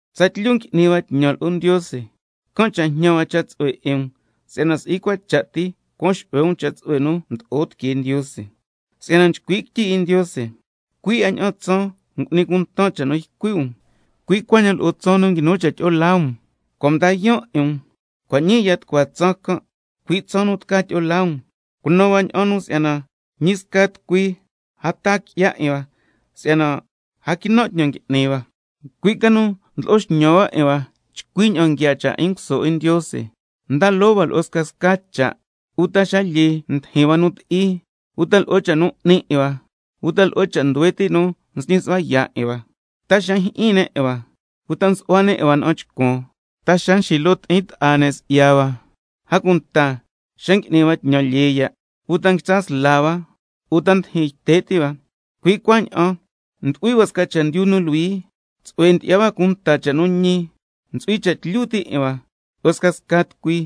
Tsatlyu ngui'ni hua tñan lo'o Ndiose, can' cha' jñan hua cha' tsu'hue 'in um si'yana si'i cua cha' ti cuan xu'hue um cha' tsu'hue nu mdo'o tiquee Ndiose, si'yana nchcui' quityi 'in Ndiose: —Cui' 'a ña'an tsaan m'nin cunta cha' nu ycui' um, cui' cuaña'an lo'o tsaan nu nguinu cha' tyi'o laa um, cua' mdan yaan' 'in um. Cua' ñii ya tucua tsaan can', cui' tsaan nu tca tyi'o laa um—. Cunan hua ña'an si'yana ñi sca tucui lo' a taa qui'ya 'in hua, si'yana a quinan' tñan ngui'ni hua, cui' ca nu ndlo'o xñan hua 'in hua chcui ña'an nguiaa cha' 'in nguso 'in Ndiose. Nda loo hua lo'o scasca cha', uta xa lyee ndijin hua nu ti'i, uta lo'o cha' nu 'ni 'in hua, uta lo'o cha' nduhue ti' nu nsñi su'hua yaa' 'in hua, ta xa njyi'in ne' 'in hua, uta nsu'hua ne' 'in hua na'an chcuan, ta xa nxilo ti'in ta'a ne' si'ya hua, a cunta xa ngui'ni hua tñan lyee ya', uta nguitsa sla hua, lo' ta ndijin yte' ti' hua. Cui' cuaña'an ndu'hui hua sca chendyu nu luhui, tsu'hue ndyi'ya hua cunta cha' nu ñi, ntsu'hui cha' tlyu ti' 'in hua lo'o scasca tucui,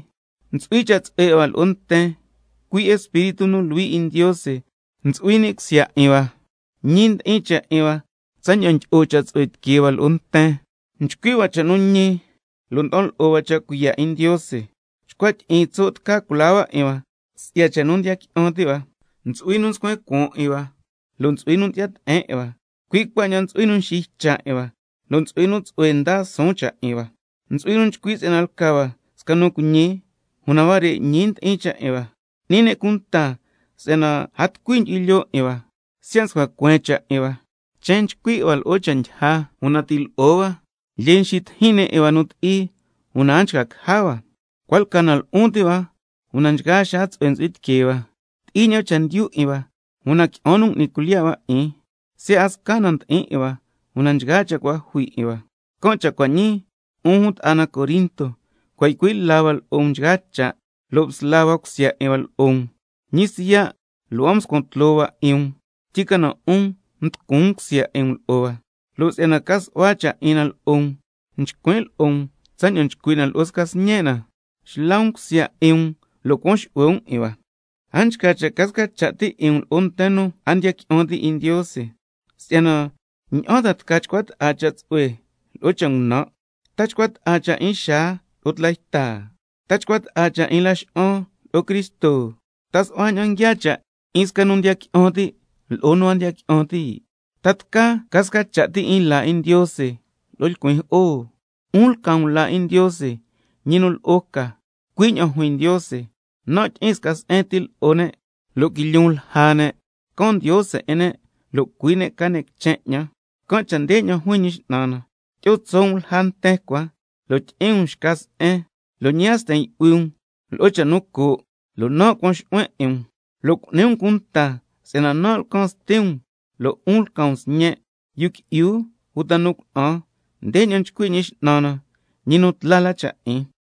ntsu'hui cha' tsu'hue 'in hua lo'o nten, cui' Espíritu nu Luhui 'in Ndiose ntsu'hui ni' cusya 'in hua, ñi ndi'in cha' 'in hua tsaña'an ndyi'o cha' tsu'hue tiquee hua lo'o nten, nchcui' hua cha' nu ñi, lo' nda'an lo'o hua cha' cuiya' 'in Ndiose, chcua tyi'iin tso' tca culaa hua 'in hua si'ya cha' nu ñi ndiya qui'an ti' hua, ntsu'hui nu nscuen cuaan 'in hua lo' ntsu'hui nu ndyi'ya te'en 'in hua, cui' cuaña'an ntsu'hui nu nxiycha' 'in hua lo' ntsu'hui nu tsu'hue ndaa suun cha' 'in hua, ntsu'hui nu nchcui' si'yana lca hua sca nu cuiñi, una huare' ñi ndi'in cha' 'in hua. N'ni ne' cunta si'yana a tucui ndyu'hui lyoo 'in hua, siya' mscua cueen cha' 'in hua, chen nchcui 'in hua lo'o cha' ndyija, una ti' lo'o hua, lyee nxitijin ne' 'in hua nu ti'i, una a nchca caja hua, cua' lca na lu'un ti' hua, una nchgaa xaa tsu'hue ntsu'hui tiquee hua, ti'i ña'an chendyu 'in hua, una qui'an nu cua' ngui'ni cuilyiya' hua 'in, siya' a sca na ndi'in 'in hua, una nchgaa cha' cua' jui 'in hua. Can' cha' cua' ñii, 'un jun ta'a na Corinto, cua' ycui' la hua lo'o um nchgaa cha', lo' msla hua cusya 'in hua lo'o um. Ñi siya' lo' a mscuan tloo hua 'in um, tyicana 'un mducun um cusya 'in um lo'o hua. Lo' si'yana ca su'hua cha' 'in na lo'o um, (nchcuin' lo'o um tsaña'an nchcui' na lo'o sca sñe' na), xla um cusya 'in um lo' cuan xu'hue um 'in hua. A nchca cha' ca sca cha' ti 'in um lo'o nten nu a ndiya qui'an ti' 'in Ndiose, si'yana ¿ña'an ta tca chcua ta'a cha' tsu'hue lo'o cha' ngunan'? ¿Ta nchcua ta'a cha' 'in xaa lo'o tla yta? ¿Ta nchcua ta'a cha' 'in Laxa'an lo'o Cristo? ¿Ta su'hua ña'an nguiaa cha' 'in sca nu ndiya qui'an ti' lo'o nu a ndiya qui'an ti'? ¿Ta tca ca sca cha' ti laa 'in Ndiose lo'o lcuin jo'o? 'Un lca um laa 'in Ndiose, ñi nu lo'o ca, cui' ña'an juin Ndiose: —Nan' tyi'in sca se'en ti lo'o ne', lo' quilyun lja ne', can Ndiose 'in ne' lo' cui' ne' ca ne' quichen 'ñan—. Can' cha' ndeña'an juin Ñi X'nan na: —Tyi'o tso' um lja nten cua, lo' tyi'in um xca se'en, lo' ñi a sten yu'hui um lo'o cha' nu coo', lo' nan' cuan xu'huen 'in um, lo' cu'ni um cunta si'yana nan' lcan Sti um, lo' 'un lca um sñen', yu qui'yu uta nu cuna'an, ndeña'an nchcui' Ñi X'nan na, ñi nu tla la cha' 'in—.